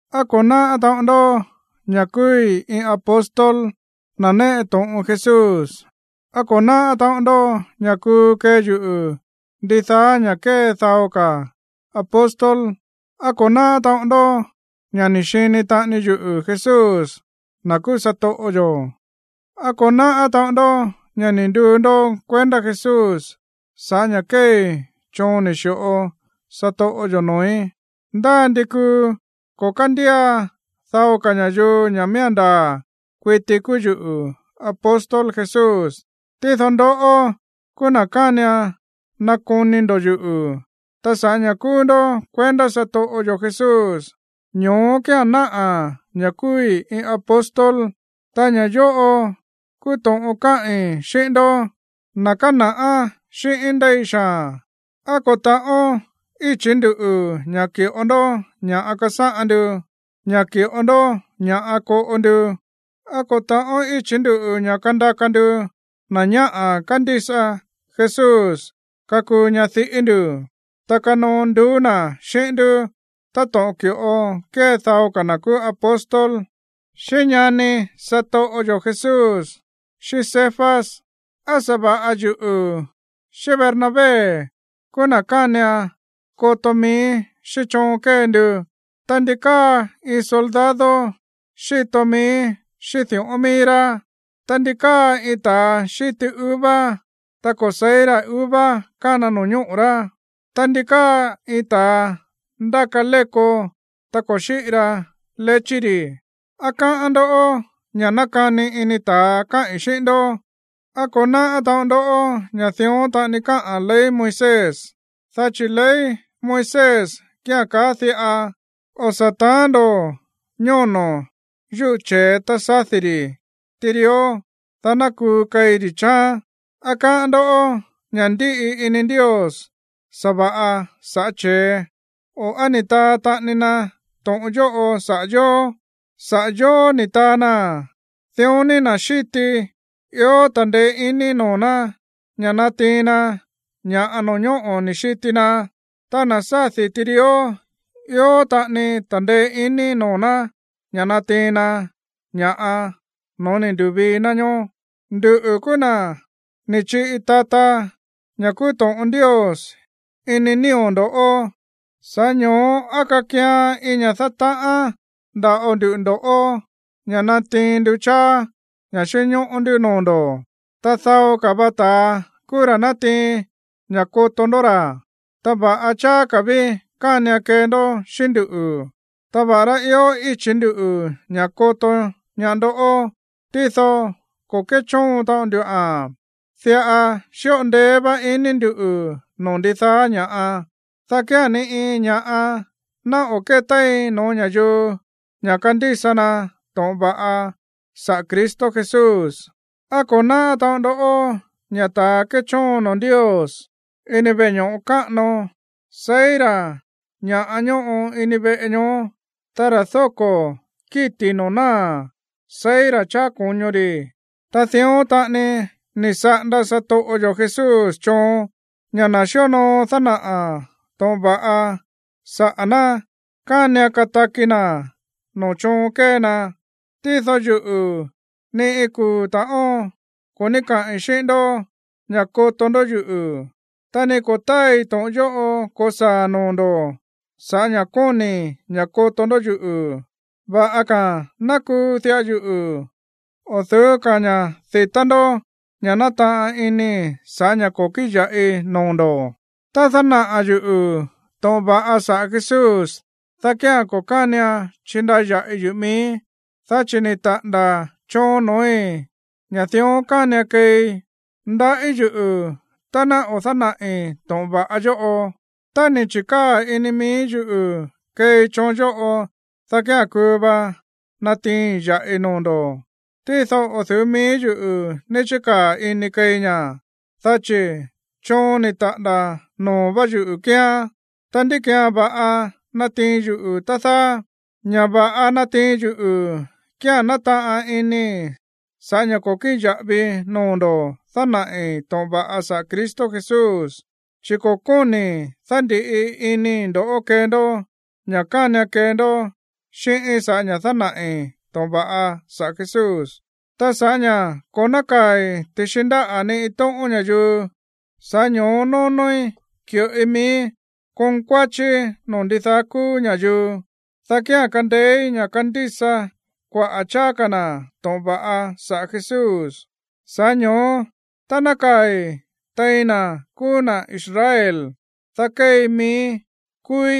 ¿Á ko̱ náꞌá taꞌon ndó ña̱ kúúí iin apóstol, na̱ néꞌe to̱ꞌon Jesús? ¿Á ko̱ náꞌá taꞌon ndó ña̱ kuu kee yuꞌu̱ ndidaá ña̱ꞌa kée dao ka̱ apóstol? ¿Á ko̱ náꞌá taꞌon ndó ña̱ ni̱ xini taꞌani yuꞌu̱ Jesús, na̱ kúú satoꞌo yo̱? ¿Á ko̱ náꞌá taꞌon ndó ña̱ ni̱ nduu ndó kuendá Jesús sa̱ꞌá ña̱ kéei choon ni̱ xi̱ꞌo satoꞌo yo̱ noo̱í? Ndá ndi kuu ko̱ kándía dao ka̱ ña̱yuu ña̱ miía̱n ndaa̱ kuiti kúú yuꞌu̱ apóstol Jesús, tído ndoꞌó kúú na̱ kánian nakoni ndo̱ yuꞌu̱. Ta sa̱ꞌá ña̱ kúú ndó kuendá satoꞌo yo̱ Jesús, ño̱ó kía̱n náꞌa̱ ña̱ kúúí iin apóstol. Ta ña̱ yóꞌo kúú to̱ꞌon káꞌi̱n xíꞌín ndoꞌó, na̱ kána̱ꞌá xíꞌíín ndéi xaa̱n: ¿Á ko̱ ta̱ꞌón íchi̱ ndú ña̱ ki̱ꞌo ndó ña̱ꞌa kasáꞌan ndu, ña̱ ki̱ꞌo ndó ña̱ꞌa koꞌo ndu? ¿Á ko̱ ta̱ꞌón íchi̱ ndú ña̱ kandaka ndu na̱ ñáꞌa̱ kándísa Jesús kakuu ñadiꞌí ndu̱, ta kanoo nduú na̱ xíꞌín ndú, táto̱ꞌon ki̱ꞌo kée dao ka̱ na̱ kúú apóstol, xíꞌín ñani satoꞌo yo̱ Jesús, xíꞌín Cefas? ¿Á sa̱va̱ꞌa yuꞌu̱ xíꞌín Bernabé kúú na̱ kánian koto mií xíꞌín choon kée ndu? Ta, ¿ndi káa iin soldado xíto mií xíꞌín di̱ꞌón mií rá? Ta, ¿ndi káa iin ta̱a xíti uva, ta ko̱ se̱í ra̱ uva kána no̱ñóꞌo̱ rá? Ta, ¿ndi káa iin ta̱a ndáka léko, ta ko̱ xíꞌi ra lechí ri̱? ¿Á káꞌán ndó ña̱ nákani ini ta̱a káꞌi̱n xíꞌín ndó? ¿Á ko̱ náꞌá taꞌon ndó ña̱ dión taꞌani káꞌa̱n ley Moisés? Dá chi̱ ley Moisés kía̱n kaá diꞌa: “O̱ sa̱ ta̱án ndo̱ ñóno̱ yúꞌu̱ che̱e tá sádi̱ ri̱ tirió, dá ná kuu keí rí chááán.” ¿Á káꞌán ndó ña̱ ndíꞌi ini Ndios sa̱va̱ꞌa sa̱ꞌá che̱e? O, ¿á ni̱ taa taꞌani na to̱ꞌon yóꞌo saꞌa̱ yóó? Saꞌa̱ yóó ni̱ taa naa̱n. Ta dión ni na̱ xíti, ió ta̱ndeé iní noo̱ ná ña̱ natiin na ña̱ꞌa no̱ñóꞌo̱ ni̱ xiti na, ta na̱ sádi̱ tirió, ió taꞌani ta̱ndeé iní noo̱ ná ña̱ natiin na ña̱ꞌa no̱ó ni̱ ndu̱vii na ñoó. Nduꞌu̱ kúú na̱ ni̱ chiꞌi tata ña̱ kúú to̱ꞌon Ndios ini nío̱ ndo̱, sa̱ꞌá ño̱ó, ¿á kakian iin ña̱ dátaꞌán nda̱ꞌo nduꞌu̱ ndo̱ꞌó ña̱ natiin nduꞌu̱ cháá ña̱ xínñóꞌó ndú noo̱ ndo̱? Tá dao ka̱ va ta̱a kúú ra̱ nátiin ña̱ xíto ndó ra̱, ta va̱ꞌa cháá ka̱ ví kánian kee ndó xíꞌín nduꞌu̱. Ta va̱ꞌará ió íchi̱ ndú ña̱ koto ñaá ndó, tído ko̱ kéchóon taꞌon nduꞌa̱n. Diꞌa xíꞌo ndeé vá iní ndu̱ no̱ó ndidaá ña̱ꞌa, dá kía̱n ni iin ña̱ꞌa ná o̱ kétéin no̱ó ña̱yuu ña̱ kandísa na to̱ꞌon va̱ꞌa saꞌa̱ Cristo Jesús. ¿Á ko̱ náꞌá taꞌon ndó ña̱ ta̱a kéchóon noo̱ Ndios ini veꞌe ño̱ꞌo káꞌano seí ra̱ ña̱ ñóꞌo ini veꞌe ñoó, ta ra̱ dóko̱ kíti̱ noo̱ náa̱ seí ra̱ cháá ko̱ño ri̱? Dión taꞌani ni̱ saꞌanda satoꞌo yo̱ Jesús choon ña̱ na̱ xíonoo dánaꞌa̱ to̱ꞌon va̱ꞌa saꞌa̱ ná, kánian kataki na̱ noo̱ choon kée na. Tído yuꞌu̱, ni iin kuu̱ ta̱ꞌón ko̱ ní kaꞌi̱n xíꞌín ndó ña̱ koto ndó yuꞌu̱, ta ni ko̱ táai to̱ꞌon yóꞌo ko̱saa̱ noo̱ ndo̱ sa̱ꞌá ña̱ kóni̱i̱ ña̱ koto ndó yuꞌu̱. Va̱ꞌa ka̱a̱n ná kuu diꞌa yuꞌu̱, o̱ du̱ú ka̱ ña̱ di̱tá ndó ña̱ nátaꞌan inii̱ sa̱ꞌá ña̱ ko̱ kíꞌin ya̱ꞌi noo̱ ndo̱. Tá dánaꞌa̱ yuꞌu̱ to̱ꞌon va̱ꞌa saꞌa̱ Jesús, dá kía̱n ko̱ kánian chindaya̱ꞌi yuꞌu̱ miíí, dá chi̱ ni̱ taꞌa̱nda̱ choon no̱ói̱ ña̱ dión kánian keei. Ndaꞌí yuꞌu̱ tá ná o̱ dánaꞌi̱ to̱ꞌon va̱ꞌa yóꞌo. Tá ni̱ chi̱kaa̱ ini mií yuꞌu̱ keei choon yóꞌo, dá kía̱n kuu va natiiin ya̱ꞌi noo̱ ndo̱. Tído o̱ du̱ú mií yuꞌu̱ ní chíkaa̱ inii̱ keei ña̱, dá chi̱ choon ni̱ taꞌa̱nda̱ noo̱ vá yuꞌu̱ kíán. Ta, ¿ndí ki̱án va̱ꞌa nátiin yuꞌu̱, tá dáá? Ña̱ va̱ꞌa nátiin yuꞌu̱ kía̱n nátaꞌan inii̱ sa̱ꞌá ña̱ ko̱ kíꞌin ya̱ꞌavii noo̱ ndo̱ dánaꞌi̱ to̱ꞌon va̱ꞌa saꞌa̱ Cristo Jesús. Chi̱ ko̱ kóni̱i̱ dándi̱ꞌi inii̱ ndo̱ꞌó kee ndó ña̱ kánian kee ndó xíꞌíín sa̱ꞌá ña̱ dánaꞌi̱ to̱ꞌon va̱ꞌa saꞌa̱ Jesús. Ta sa̱ꞌá ña̱ ko̱ nákaa̱i̱ ti̱xi ndáꞌa̱ ni iin tóꞌón ña̱yuu, sa̱ꞌá ño̱ó nónóí ki̱ꞌoi miíí konkuáchíí noo̱ ndidaá kúú ña̱yuu, dá kía̱n kandeéí ña̱ kandísa kuaꞌa̱ cháá ka̱ na̱ to̱ꞌon va̱ꞌa saꞌa̱ Jesús. Sa̱ꞌá ño̱ó, tá nákaa̱i̱ tein na̱ kúú na̱ Israel, dá kéei miíí kúúí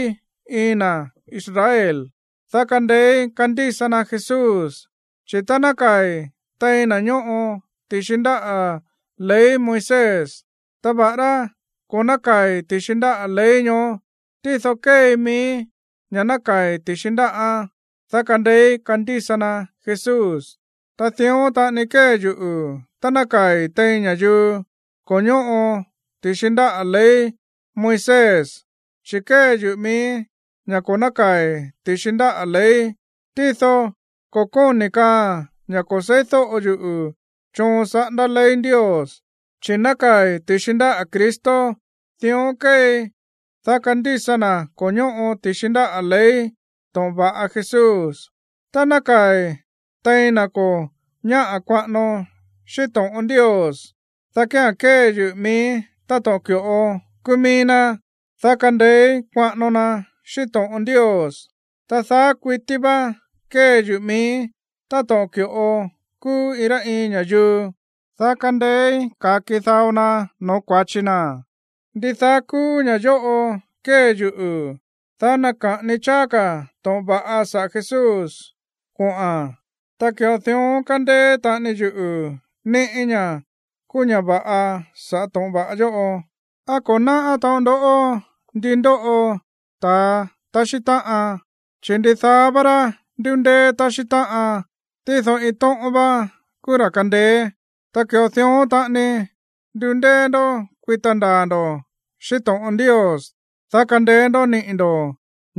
iin na̱ Israel, dá kandeéí kandísa na Jesús. Chi̱ tá nákaa̱i̱ tein na̱ ñóꞌo ti̱xi ndáꞌa̱ ley Moisés, ta va̱ꞌará ko̱ nákaa̱i̱ ti̱xi ndáꞌa̱ ley ñoó, tído kéei miíí ña̱ nákaa̱i̱ ti̱xi ndáꞌán, dá kandeéí kandísa na Jesús. Ta dión taꞌani kée yuꞌu̱ tá nákaa̱i̱ tein ña̱yuu ko̱ ñóꞌo ti̱xi ndáꞌa̱ ley Moisés, chi̱ kée yuꞌu̱ miíí ña̱ ko̱ nákaa̱i̱ ti̱xi ndáꞌa̱ ley. Tído ko̱ kóni̱ kaaa̱n ña̱ ko̱ se̱ídóꞌo yuꞌu̱ choon saꞌándá ley Ndios, chi̱ nákaa̱i̱ ti̱xi ndáꞌa̱ Cristo. Dión kéei, dá kandísa na̱ ko̱ ñóꞌo ti̱xi ndáꞌa̱ ley to̱ꞌon va̱ꞌa Jesús. Tá nákaa̱i̱ tein na̱ ko̱ ñáꞌa̱ kuaꞌano xíꞌín to̱ꞌon Ndios, dá kía̱n kée yuꞌu̱ miíí táto̱ꞌon ki̱ꞌo kúú mií ná, dá kandeéí kuaꞌano na xíꞌín to̱ꞌon Ndios. Ta daá kuití vá kée yuꞌu̱ miíí táto̱ꞌon ki̱ꞌo kúú iin rá iin ña̱yuu, dá kandeéí ka̱ki dao na no̱ó kua̱chi na̱. Ndidaá kúú ña̱ yóꞌo kée yuꞌu̱, dá naka̱ꞌani cháá ka̱ to̱ꞌon va̱ꞌa saꞌa̱ Jesús kuaꞌa̱n, ta ki̱ꞌo dión kandeé taꞌani yuꞌu̱ ni̱ꞌí ña̱ kúú ña̱ va̱ꞌa sa̱ꞌá to̱ꞌon va̱ꞌa yóꞌo. ¿Á ko̱ náꞌá taꞌon ndó ndi ndóꞌo ta̱a taxí táꞌan? Chi̱ ndidaá vá rá ndúndéé taxí táꞌan, tído iin tóꞌón vá kúú ra̱ kándéé. Ta ki̱ꞌo dión taꞌani ndundéé ndó kuita ndaa̱ ndo̱ xíꞌín to̱ꞌon Ndios, dá kandeé ndó niꞌi̱ ndo̱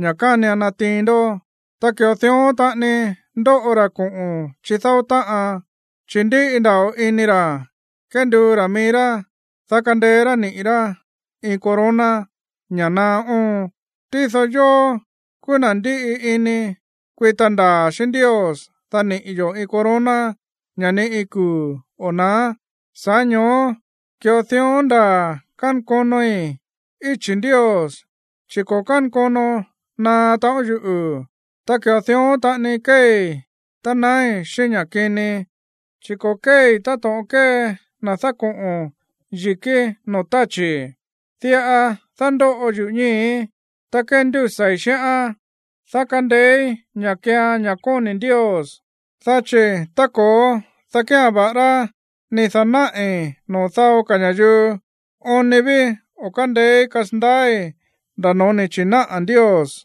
ña̱ kánian natiin ndó. Ta ki̱ꞌo dión taꞌani ndóꞌo ra̱ koꞌo̱n chídáó táꞌan, chi̱ ndíꞌi nda̱ꞌo ini ra̱ kénduu ra̱ mií rá, dá kandeé rá niꞌi̱ rá iin corona, ña̱ naá óon. Tído yóó kúú na̱ ndíꞌi ini kuita ndaa̱ xíꞌín Ndios, dá niꞌi̱ yo̱ iin corona, ña̱ ni iin kuu̱ o̱ na̱á. Sa̱ꞌá ño̱ó ki̱ꞌo dión ndaa̱ kánkonoi íchi̱ Ndios, chi̱ ko̱ kánkono naá taꞌon yuꞌu̱. Ta ki̱ꞌo dión taꞌani kéei tá naái̱ xíꞌín ña̱ kini, chi̱ ko̱ kéei táto̱ꞌon kée na̱ dákoꞌo̱n yi̱kí noo̱ táchi̱. Diꞌa dándóꞌo yuꞌu̱ ñíi̱í, ta kéndúsa̱i̱ xíꞌán, dá kandeéí ña̱ keean ña̱ kóni̱ Ndios. Dá chi̱ tá ko̱ó, dá kía̱n, va̱ꞌará ni̱ da̱náꞌi̱ noo̱ dao ka̱ ña̱yuu, oon ni ví o̱ kándeéí kasandaái̱ nda̱ no̱ó ni̱ chi̱náꞌa̱ Ndios.